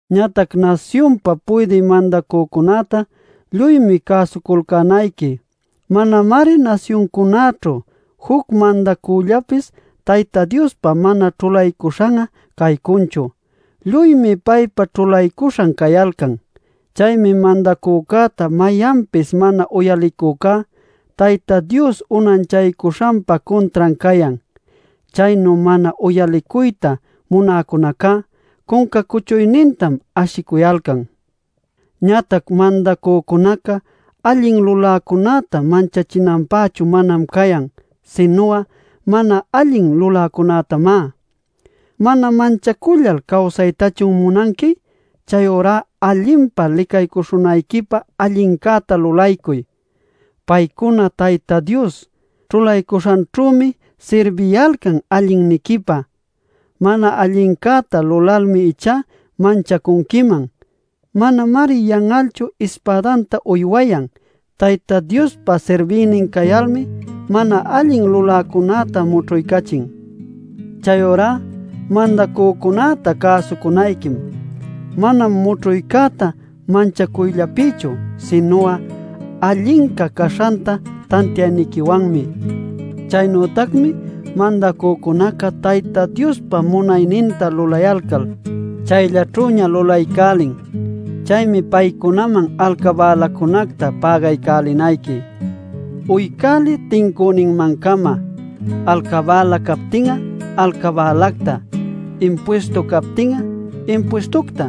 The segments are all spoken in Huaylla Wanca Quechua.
Ñatac nasyunpa puydï mandacücunäta lluymi cäsuculcänayqui. Manamari nasyuncunaćhu juc mandacüllapis Tayta Diospa mana ćhulaycuśhan'a caycunchu. Lluymi paypa ćhulaycuśhan cayalcan. Chaymi mandacücäta mayanpis mana uyalicücá Tayta Dios unanchaycuśhanpa cuntran cayan. Chaynu mana uyalicuyta munäcunacá cunca cuchuynintam ashicuyalcan. Ñatac mandacücunaca allin luläcunäta manchachinanpächu manam cayan, sinu'a mana allin luläcunätamá. ¿Mana manchacullal cawsaytachun munanqui? Chayurá allinpa licaycuśhunayquipä allincäta lulaycuy. Paycuna Tayta Dios ćhulaycuśhanćhümi sirbiyalcan allinniquipä. Mana allincäta lulalmi ichá manchacunquiman. Manamari yan'alchu ispädanta uywayan. Tayta Diospa sirbïnin cayalmi mana allin luläcunäta mućhuycachin. Chayurá mandacücunäta cäsucunayquim. Manam mućhuycäta manchacuyllapïchu, sinu'a allinca caśhanta tantiayniquiwanmi. Chaynütacmi mandacücunaca Tayta Diospa munayninta lulayalcal, chayllaćhüña lulaycälin. Chaymi paycunaman alcabälacunacta pägaycälinayqui. Uycäliy tincüninman-cama: alcabäla captin'a alcabälacta; impuistu captin'a impuistucta;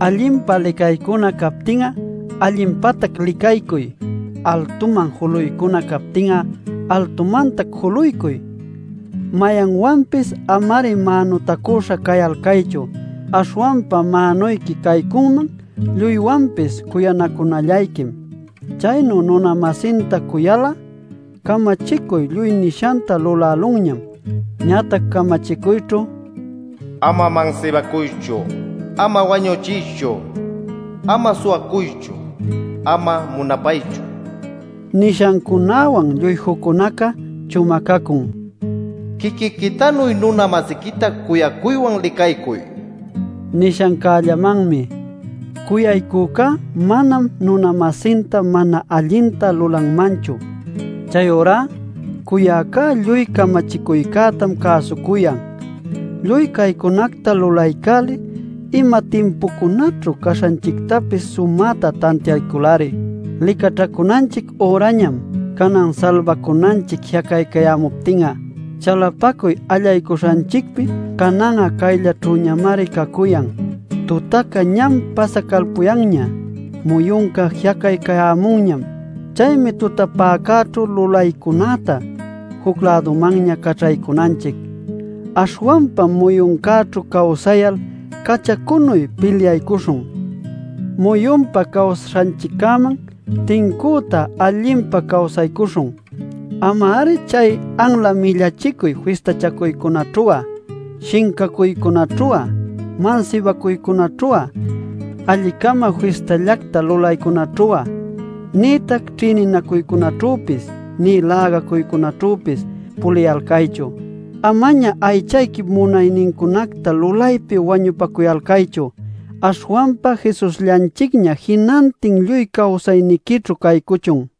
allinpa licaycuna captin'a allinpatac licaycuy; altuman juluycuna captin'a altumantac juluycuy. Mayanwanpis ama-ari mänutacüśha cayalcaychu. Aśhwanpa mänuyqui caycunman lluywanpis cuyanacunallayquim. Chaynu nuna-masinta cuyal'a camachicuy lluy nishanta lulälunñam. Ñatac camachicuyćhu: “Ama mansibacuychu, ama wañuchiychu, ama suwacuychu, ama munapaychu” nishancunäwan lluy juccunaca, chumacacun: “Quiquiquitanuy nuna-masiquita cuyacuywan licaycuy” nishancällamanmi. Cuyaycücá manam nuna-masinta mana allinta lulanmanchu. Chayurá cuyäca lluy camachicuycätam cäsucuyan. Lluy caycunacta lulaycäliy ima timpucunaćhu caśhanchictapis sumäta tantiaycul-ari. Licaćhacunanchic ürañam, canan salbacunanchic ji'acaycayämuptin'a. Chalapacuy allaycuśhanchicpi canan'a caylläćhüñamari cacuyan. Tutaca ñam pasacalpuyanña. Muyunca ji'acaycayämunñam. Chaymi tutapäcäćhu lulaycunätá juc-lädumanña caćhaycunanchic. Aśhwanpam muyuncäćhu cawsayal cachacunuy pilyaycuśhun. Muyunpa cawsaśhanchiccäman tincüta allinpa cawsaycuśhun. Ama-ari chay anla millachicuy fistachacuycunaćhu'a, shincacuycunaćhu'a, mansibacuycunaćhu'a, alli-cama fistallacta lulaycunaćhu'a, nïtac ćhïninacuycunaćhüpis nï lägacuycunaćhüpis puliyalcaychu. Amaña aychayquip munaynincunacta lulaypi wañupacuyalcaychu. Aśhwanpa Jesusllanchicña jinantin lluy cawsayniquićhu caycuchun.